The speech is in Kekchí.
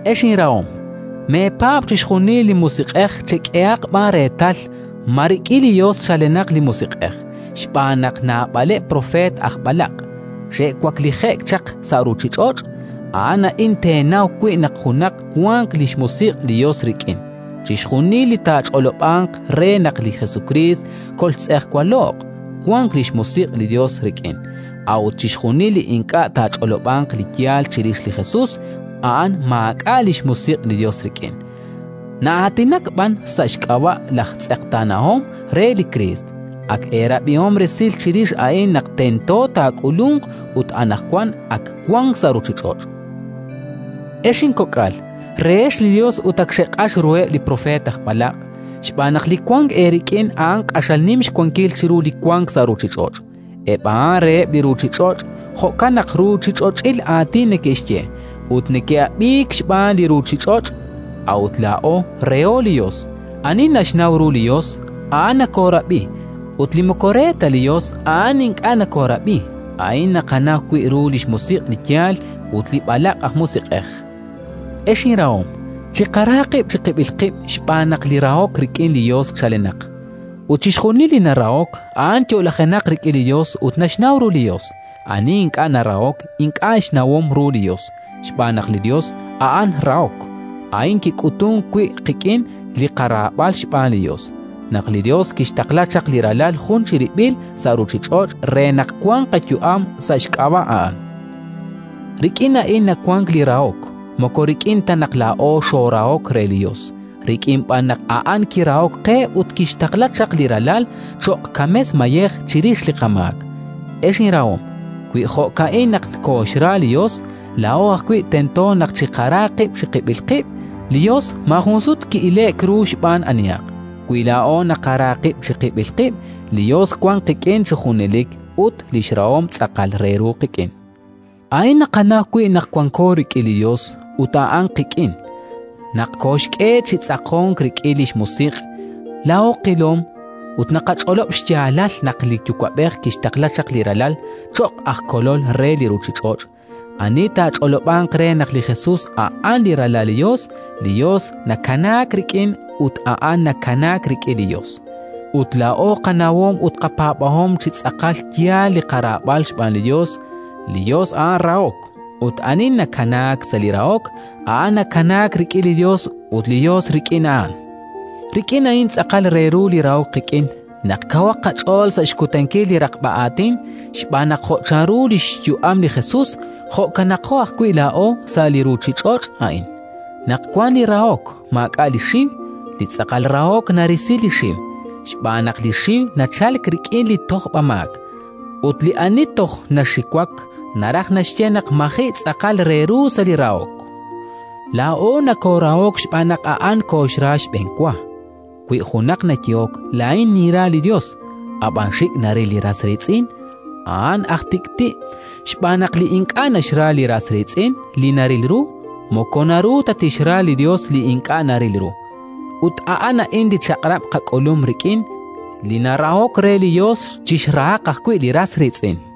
Ex inrahom, meepaab' chixjunil li musiq'ej; chek'ehaq b'an reetal ma rik'in li Yos chalenaq li musiq'ej, xb'aan naq naab'aleb' propeet aj b'alaq' xe'waklije'k chaq sa' ruuchich'och'. A'an a'in teenaw wi' naq junaq wank li xmusiq' li Yos rik'in: chixjunil li taach'olob'anq re naq li Jesukriist koltz'ejwalo'q, wank li xmusiq' li Yos rik'in; a'ut chixjunil li ink'a' taach'olob'anq li yaal chirix li Jesus, a'an maak'a' li xmusiq' li Yos rik'in, na'aatinak b'an sa' xk'ab'a' laj Tz'eqtaanahom re li Kriist. Ak eerab'ihom resil chirix a'in naq tento taak'ulunq, ut anaqwan ak wank sa' ruuchich'och'. Ex inkok'al, rehex li Yos ut ak xeq'ax ruheb' li propeet aj b'alaq', xb'aan naq Li wank eerik'in a'an q'axal nim xwankil chiru li wank sa' ruuchich'och'. Eb' a'an reheb' li ruuchich'och'; jo'kan naq ruuchich'och'il aatin neke'xye, ut neke'ab'iik xb'aan li ruuchich'och'. A'ut laa'o reho li Yos. Ani naxnaw ru li Yos, a'an nokoorab'i; ut li moko re ta li Yos, a'an ink'a' nokoorab'i. A'in naqanaw wi' ru li xmusiq' li yaal ut li b'alaq' aj musiq'ej. Ex inrahom, chiqara qib' chiqib'il qib' xb'aan naq li rahok rik'in li Yos chalenaq, ut chixjunil li narahok, a'an yo'lajenaq rik'in li Yos ut naxnaw ru li Yos. Ani ink'a' narahok, ink'a' xnawom ru li Yos, xb'aan naq li Yos a'an rahok. A'in kik'utunk wi' qik'in li qaraab'al xb'aan li Yos: naq li Yos kixtaqla chaq li Ralal jun chirib'il sa' ruuchich'och' re naq wanq qayu'am sa' xk'ab'a' A'an. Rik'in a'in nawank li rahok: moko rik'in ta naq laa'o xoorahok re li Yos, rik'in b'an naq A'an kirahok qe ut kixtaqla chaq li Ralal cho'q kames-mayej chirix li qamaak. Ex inrahom, wi jo'ka'in naq kooxra li Yos, laa'o ajwi' tento naq chiqara qib' chiqib'il qib'. Li Yos maajun sut ki'ile'k ru xb'aan anihaq. Wi laa'o naqara qib' chiqib'il qib', li Yos wank qik'in chi junelik ut li xrahom tz'aqal re ru qik'in. A'in naqanaw wi' naq wanko rik'in li Yos ut A'an qik'in: naq koxk'e chi tz'aqonk rik'in li xMusiq'. Laa'o qilom ut naqach'olob' xyaalal naq li Yuwa'b'ej kixtaqla chaq li Ralal cho'q aj Kolol re li ruuchich'och'. Ani taach'olob'anq re naq li Jesus a'an li Ralal li Yos, li Yos nakanaak rik'in ut a'an nakanaak rik'in li Yos. Ut laa'o qanawom ut qapaab'ahom chi tz'aqal yaal li qaraab'al xb'aan li Yos. Li Yos a'an rahok, ut ani nakanaak sa' li rahok, a'an nakanaak rik'in li Yos ut li Yos rik'in a'an. Rik'in a'in tz'aqal re ru li rahok qik'in: naq kawaq qach'ool sa' xkutankil li raqb'a aatin, xb'aan naq jo' chanru li xyu'am li Jesus, jo'kano ajwi' laa'o sa' li ruuchich'och' a'in. Naq wank li rahok, maak'a' li xiw. Li tz'aqal rahok narisi li xiw, xb'aan naq li xiw nachalk rik'in li tojb'amaak, ut li ani toj naxiwak naraj naxye naq maji' tz'aqal re ru sa' li rahok. Laa'o nokoorahok xb'aan naq A'an kooxra xb'enwa. Wi junaq nayehok: “Laa'in ninra li Yos”, ab'an xik' naril li ras riitz'in, a'an aj tik'ti', xb'aan naq li ink'a' naxra li ras riitz'in li naril ru, moko naru ta tixra li Yos li ink'a' naril ru. Ut a'an a'in li chaq'rab' qak'ulum rik'in: li narahok re li Yos chixrahaq ajwi' li ras riitz'in.